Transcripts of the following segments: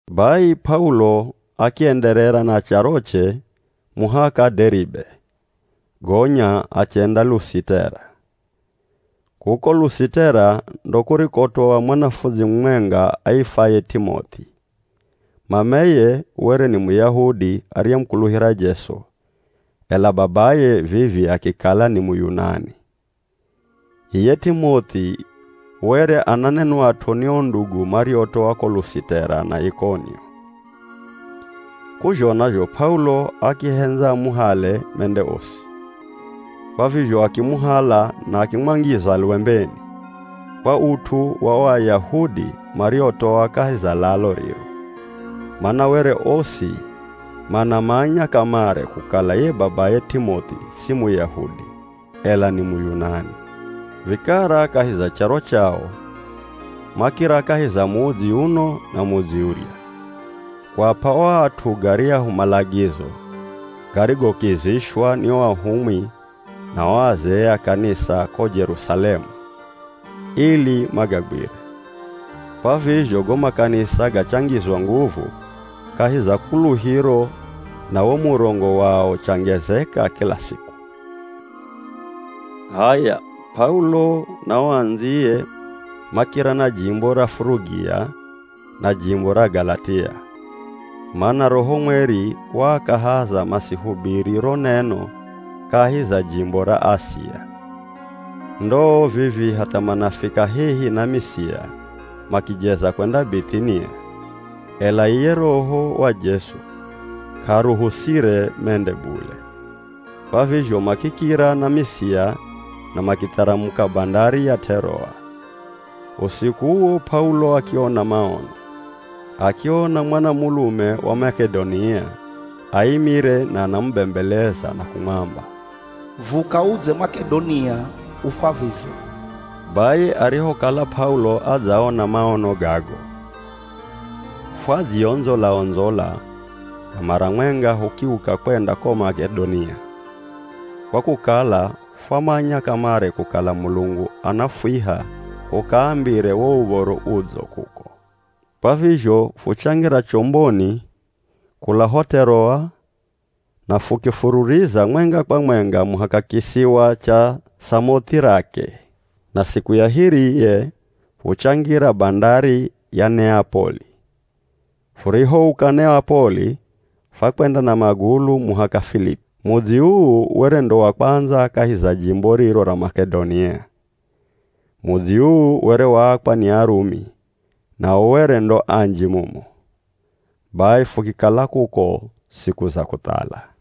Bai P'aulo akienderera na charoche muhaka Deribe, gonya achenda Lusitera. Kuko Lusitera ndo kurikotoa mwanafundzi mumwenga aifwaye T'imoth'i. Mameye were ni Muyahudi ariyemukuluhira Jesu, ela babaye vivi akikala ni Muyunani. Iye T'imoth'i were ananenwat'o ni o ndugu mariotoa ko Lusitera na Ikonio. K'uzhona zho P'aulo akihendza amuhale mende osi, kwa vizho akimuhala na akimwangiza lwembeni, kwa ut'u wa o Ayahudi mariotoa kahi za lalo riro, mana were osi manamanya kamare kukala ye babaye T'imoth'i si Muyahudi, ela ni Muyunani. Vikara kahi za charo chao, makira kahi za mudzi uno na mudzi urya, kuap'a o at'u garyahu malagizo garigokizishwa ni o ahumwi na o azee a kanisa ko Jerusalemu, ili magagwire. Kwa vizho go makanisa gachangizwa nguvu kahi za kuluhiro na wo murongo wao uchangezeka kila siku. H'aya, P'aulo na o andziye makira na jimbo ra Furugia na jimbo ra Galatia, mana Roho Mweri waakahaza masihubiri ro neno kahi za jimbo ra Asia. Ndoo vivii, hatha manafika hehi na Misia, makijeza kwenda Bith'inia ela iye Roho wa Jesu k'aaruhusire mende bule. Kwa vizho makikira na Misia na makitharamuka bandari ya T'eroa. Usiku uwo P'aulo akiona maono, akiona mwanamulume wa Mak'edonia aimire na anamubembeleza na kumwamba, “Vuka udze Mak'edonia ufwavize.” Bai arihokala P'aulo adzaona maono gago, fwadziondzola-ondzola na mara mwenga hukiuka kwenda ko Mak'edonia, kwa kukala fwamanya kamare kukala Mulungu anafwiha hukaambire wo Uv̱oro Udzo kuko. Kwa vizho fuchangira chomboni kula ho T'eroa na fukifururiza mwenga kwa mwenga muhaka kisiwa cha Samoth'irake, na siku ya hiriye fuchangira bandari ya Neapoli. Furihouka Neapoli fwakwenda na magulu muhaka Filipi. Mudzi uu were ndo wa kwandza kahi za jimbo riro ra Mak'edonia. Mudzi uu were waakwa ni Arumi nao were ndo anji mumo. Bai fukikala kuko siku za kuthala.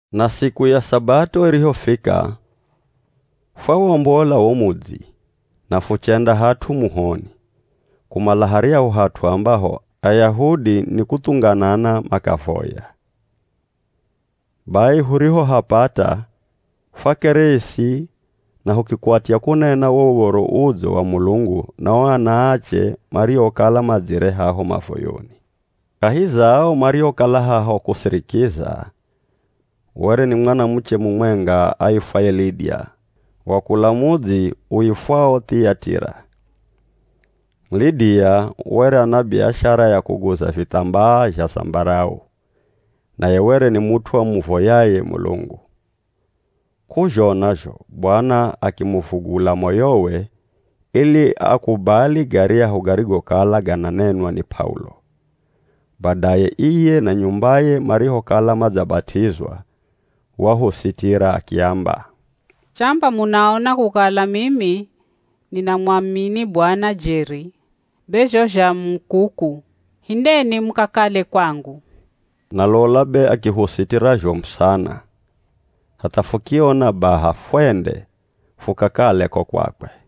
Na siku ya Sabato irihofika fwawombola wo mudzi na fuchenda hat'u muhoni, kumala haryahu hat'u ambaho Ayahudi ni kuthunganana makavoya. Bai hurihohapata fwakeresi na hukikwatya kunena wo Uv̱oro Udzo wa Mulungu na o anaache mariokala madzire haho mavoyoni. Kahi za ao mariokala haho kusirikiza, were ni mwanamuche mumwenga aifwaye Lidia wa kula mudzi uifwao Thiyatira. Lidia were ana biashara ya kuguza vithambaa zha zambarau, naye were ni mut'u amuvoyaye Mulungu. K'uzhona zho Bwana akimuvugula moyowe ili akubali garyahu garigokala gananenwa ni P'aulo. Badaye iye na nyumbaye marihokala madzabat'izwa, wahusitira akiamba, “Chamba munaona kukala mimi ninamwamini Bwana jeri, be zho zha mu kuku, hindeni mukakale kwangu.” Na lola be akihusitira zhomu sana hatha fukiona baha fwende fukakale ko kwakwe.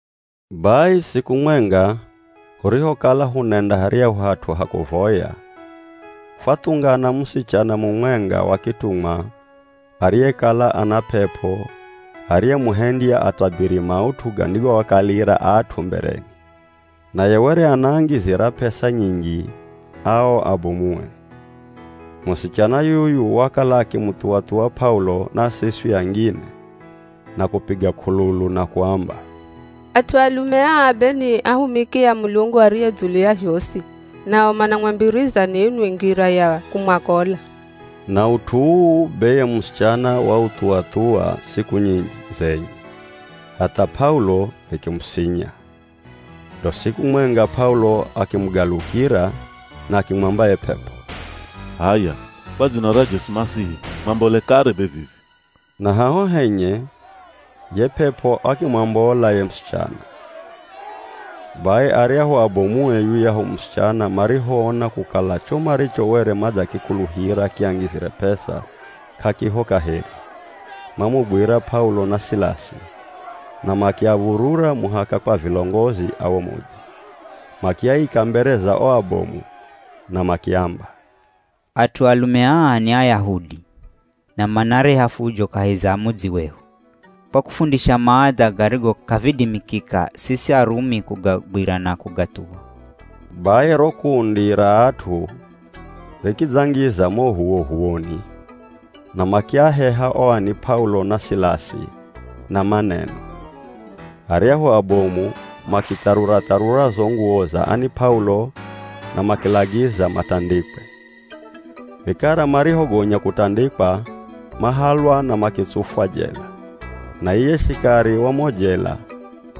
Bai siku mwenga hurihokala hunenda haryahu hat'u ha kuvoya, fwathungana musichana mumwenga wa kitumwa ariyekala ana p'ep'o ariyemuhendya atabiri maut'u gandigoakalira at'u mbereni. Naye were anaangizira p'esa nyinji ao abomue. Musichana yuyu wakala akimuthuwa-thuwa P'aulo na siswi angine na kupiga k'ululu na kuamba, “At'u alume aa be ni ahumiki a Mulungu ariye dzulu ya zhosi, nao manamwambiriza ninwi ngira ya kumwakola.” Na ut'u uu be ye musichana wauthuwa-thuwa siku nyinji zenye hatha P'aulo vikimusinya. Ndo siku mwenga P'aulo akimugalukira na akimwamba ye p'ep'o, “H'aya, kwa dzina ra Jesu Masihi mwambole kare be vivi!” Na haho henye ye p'ep'o akimwambola ye musichana. Bai aryahu abomue yuyahu musichana marihoona kukala cho maricho were madzakikuluhira kiangizire p'esa k'akiho kaheri, mamugwira P'aulo na Silasi na makiav̱urura muhaka kwa vilongozi a wo mudzi. Makiaika mbere za o abomu na makiamba, “At'u alume aa ni Ayahudi, na manareha fujo kahi za mudzi wehu, kwa kufundisha maadha garigo k'avidimikika siswi Arumi kugagwira na kugathuwa.” Bai ro kundi ra at'u rikidzangiza mo h'uwoh'uwoni, na makiaheha o ani P'aulo na Silasi na maneno. Aryahu abomu makitharura-tharura zo nguwo za ani P'aulo na makilagiza matandikwe. Vikara marihogonya kutandikwa mahalwa na makitsufwa jela, na iye shikari wa mo jela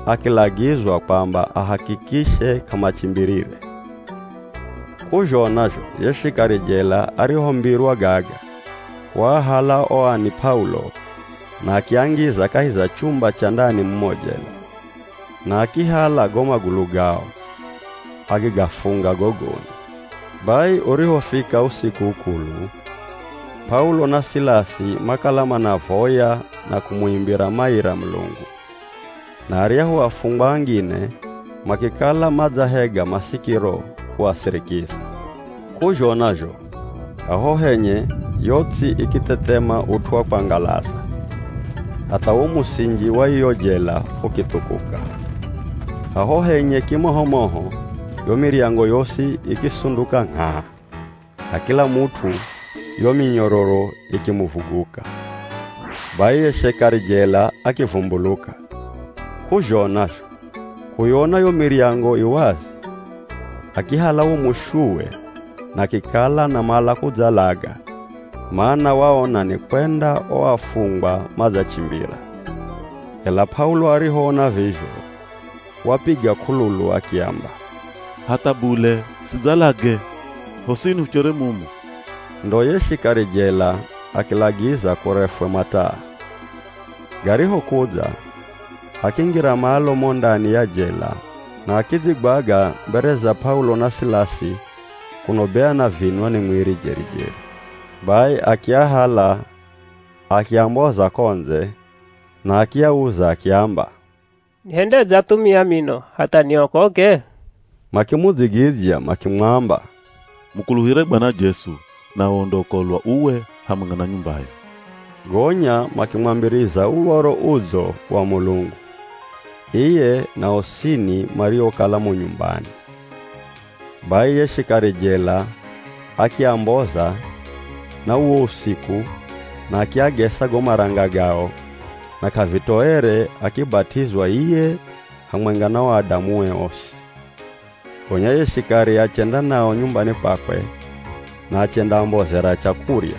akilagizwa kwamba ahakikishe k'amachimbirire. K'uzhona zho ye shikari jela arihombirwa gaga, waahala o ani P'aulo na akiangiza kahi za chumba cha ndani mumo jela, na akihala go magulu gao akigafunga gogoni. Bai urihofika usiku ukulu, P'aulo na Silasi makala manavoya na kumuimbira maira Mulungu, na aryahu afungwa angine makikala madzahega masikiro kuasirikiza. K'uzhona zho haho henye yo ts'i ikithethema ut'u wa kwangalaza, hatha wo musinji wa iyo jela ukithukuka. Haho henye kimoho moho, yo miryango yosi ikisunduka ngh'aa na kila mut'u yo minyororo ikimuvuguka. Bai ye shikari jela akivumbuluka, k'uzhona zho kuyona yo miryango i wazi, akihala wo mushuwe na akikala anamala kudzalaga, mana waona nikwenda o afungwa madzachimbira. Ela P'aulo arihoona vizho wapiga k'ululu akiamba, “Hatha bule, sidzalage! Hosini huchere mumu!” Ndo ye shikari jela akilagiza kurefwe mataa. Garihokudza, akingira malo mo ndani ya jela na akidzigwaga mbere za P'aulo na Silasi kuno be anavinwa ni mwiri jeri-jeri. Bai akiahala akiamboza ko ndze, na akiauza akiamba, “Nihendedze athumia mino, hatha niokoke?” Makimudzigidzya makimwamba, “Mukuluhire Bwana Jesu, nawe undaokolwa uwe hamwenga na nyumbayo.” Gonya makimwambiriza Uv̱oro Udzo wa Mulungu, iye na osini mariokala mo nyumbani. Bai ye shikari jela akiamboza na uwo usiku na akiagesa go maranga gao na k'avitoere akibat'izwa iye hamwenga na o adamue osi. Gonya ye shikari achenda nao nyumbani kwakwe na achendaambozera chakurya,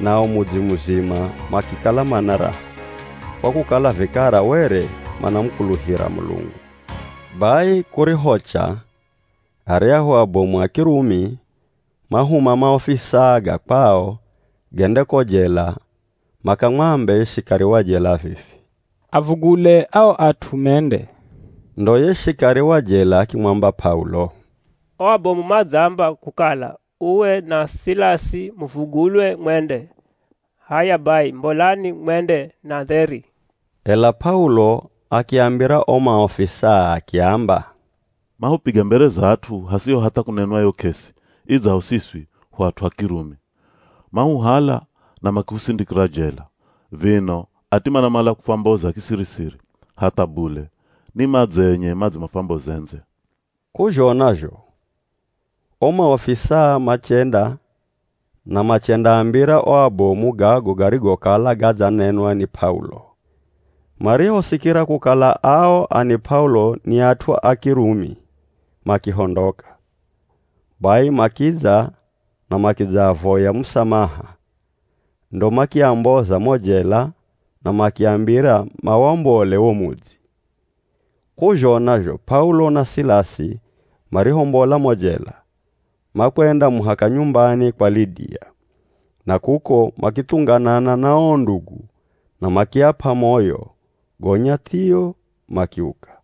nao mudzi muzima makikala mana raha, kwa kukala vikara were manamukuluhira Mulungu. Bai kurihocha aryahu abomu a Kirumi mahuma maofisaa ga kwao gende ko jela makamwambe ye shikari wa jela vivi, “Avugule ao at'u mende.” Ndo ye shikari wa jela akimwamba P'aulo, “O abomu madzaamba kukala uwe na Silasi muvugulwe mwende. H'aya bai mbolani mwende na dheri.” Ela P'aulo akiambira o maofisaa akiamba, “Mahupiga mbere za at'u hasiho hatha kunenwa yo k'esi idzaho siswi hu at'u a Kirumi. Mahuhala na makihusindikira jela, vino ati manamala kufwamboza kisiri-siri. Hatha bule, ni madze enye madze mafwamboze ndze.” K'uzhona zho o maofisaa machenda na machendaambira o abomu gago garigokala gadzanenwa ni P'aulo. Marihosikira kukala ao ani P'aulo ni at'u a Kirumi, makihondoka. Bai makidza na makidzaavoya musamaha ndo makiamboza mo jela na makiambira mawombole wo mudzi. K'uzhona zho P'aulo na Silasi marihombola mo jela, makwenda muhaka nyumbani kwa Lidia, na kuko makithunganana na o ndugu na makiap'a moyo gonya thio makiuka.